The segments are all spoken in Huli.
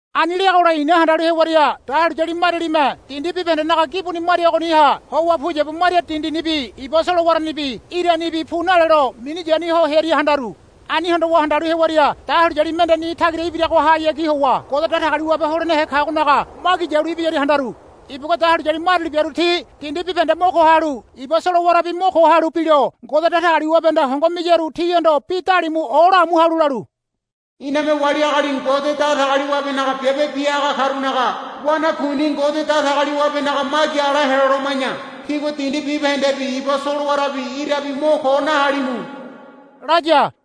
Ani leagola i̱na handalu hewaria dahuliyali marialime dindi bibahendenaga gibuni maria ngagoniha howa puyabu maria dindinibi iba solowaranibi iranibi pu nalelo minu yania ho hearia handaru. Ani hondowa handalu hewaria dahuliyali mende ni tagira ibiragohayagi howa Ngode Datagaliwabe holenehe kagonaga magi yalu ibiyaria handaru. Ibugua dahuliyali mariali biaru ti dindi bibahende mo ko halu iba solowarabi mo ko halu bilo Ngode Datagaliwabehanda hongo miyaru tihondo bi dalimu olaamu halu lalu, Iname wali agali Ngode Datagaliwabenaga biabe bia haga karunaga wanakuini Ngode Datagaliwabenaga magi ala heloloma̱ya tígua dindi bibahendebi iba solowarabi irabi mo ko nahalimu, laya.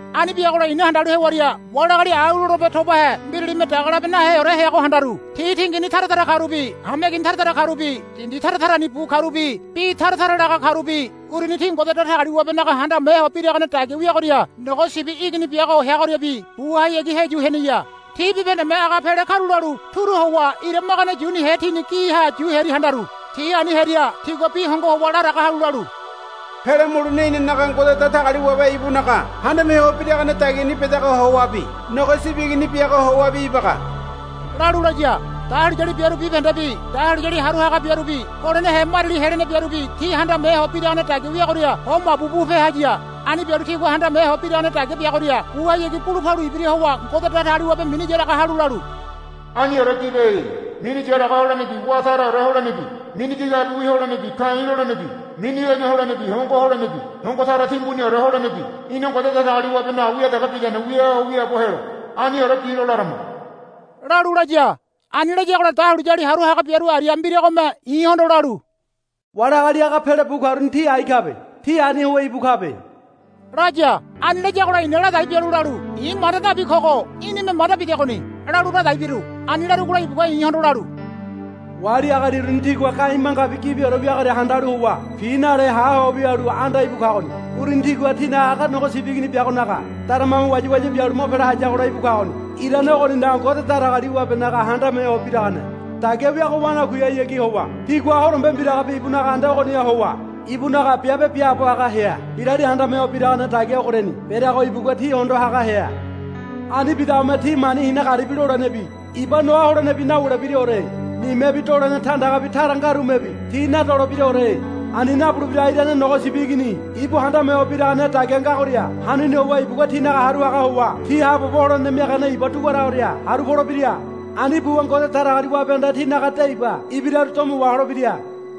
Ani biagola i̱na handalu hewaria wali agali au lolebe tobahe mbiralime daga labe naheore heago handaru. Ti tingini tara tara karubi hameigini tara tara karubi dindi tara tarani bu karubi bi tara tara laga karubi uruni ti Ngode Datagaliwabenaga handame ho biragane dagia wiagoria Nogo Sibi Igini biago heagoriabi buhayagi heyu heneya. Ti bibahendeme aga pele karulalu turu howa ira magane yunihe tini giha yu hearia handaru. Ti ani hearia tigua bi hongo howa laraga halu lalu, Pele mulene inanaga Ngode Datagaliwabe ibunaga handame ho biragane dagiani bedagoha howabi Nogo Sibi Igini biagoha howabi ibaga, lalu laya. Dahuliyali biaru bibahendebi dahuliyali haru haga biarubi holenehe mariali helene biarubi ti handame ho biragane dagia wiagoria ho mabu bupe haya. Ani bialu tigua handame ho biragane dagia biagoria buhayagi bulu palu ibira howa Ngode Datagaliwabe mini yaraga halu lalu, Aniore bibe. Mini yaraga holenebi wá taraore holenebi mini gigabiwi holenebi ka̱i̱ lolenebi mini lene holenebi hongo holenebi hongo tara timbuniore holenebi ina Ngode Datagaliwabenaga wia dege bidane wia ho wiaabo helo. Aniore bilo larama, lalu laya. Ani layagola dahuliyali haru haga biaru aria mbiragome i̱hondo lalu, Wali agali aga pele bu karuni ti ai kabe. Ti ani howa íbu kabe, laya. Ani layagola i̱na ladai bialu lalu, I̱ manda nabi kogo í̠nime manda bidegoni, lalu ladai biru. Ani larugola ibugua i̱hondo lalu, Wali agali uruni tigua ga̱i̱ mangabi gibiore wiagoria handalu howa pi nale ha ho wialu anda íbu kagoni. Uruni tigua tinaga aga Nogo Sibi Igini biagonaga daramame wayawaya bialu mo pele hayagola íbu kagoni. Irane ogoninaga Ngode Datagaliwabenaga handame ho biragane dagia wiago wanakuihayagi howa tigua horombe mbiragabi ibunaga anda ogoniha howa ibunaga biabe biaabo haga hea. Mbirali handame ho biragane dagia ogoriani bereago ibugua ti hondo haga hea. Ani bidagome ti mani hina garibi lolenebi iba noa holenebi nawulebiraore. Nimebi dolene tandagabi tara ngarumebi ti nadolebiraore. Ani nabulebirago irane Nogo Sibi Igini ibu handame ho biragane dagia ngagoria hanuni howa ibugua tinaga haru haga howa ti haabobo holene miagane iba duguaragoria haru polebira. Ani buwa Ngode Datagaliwabehanda tinaga de iba ibiraru domo waholebira.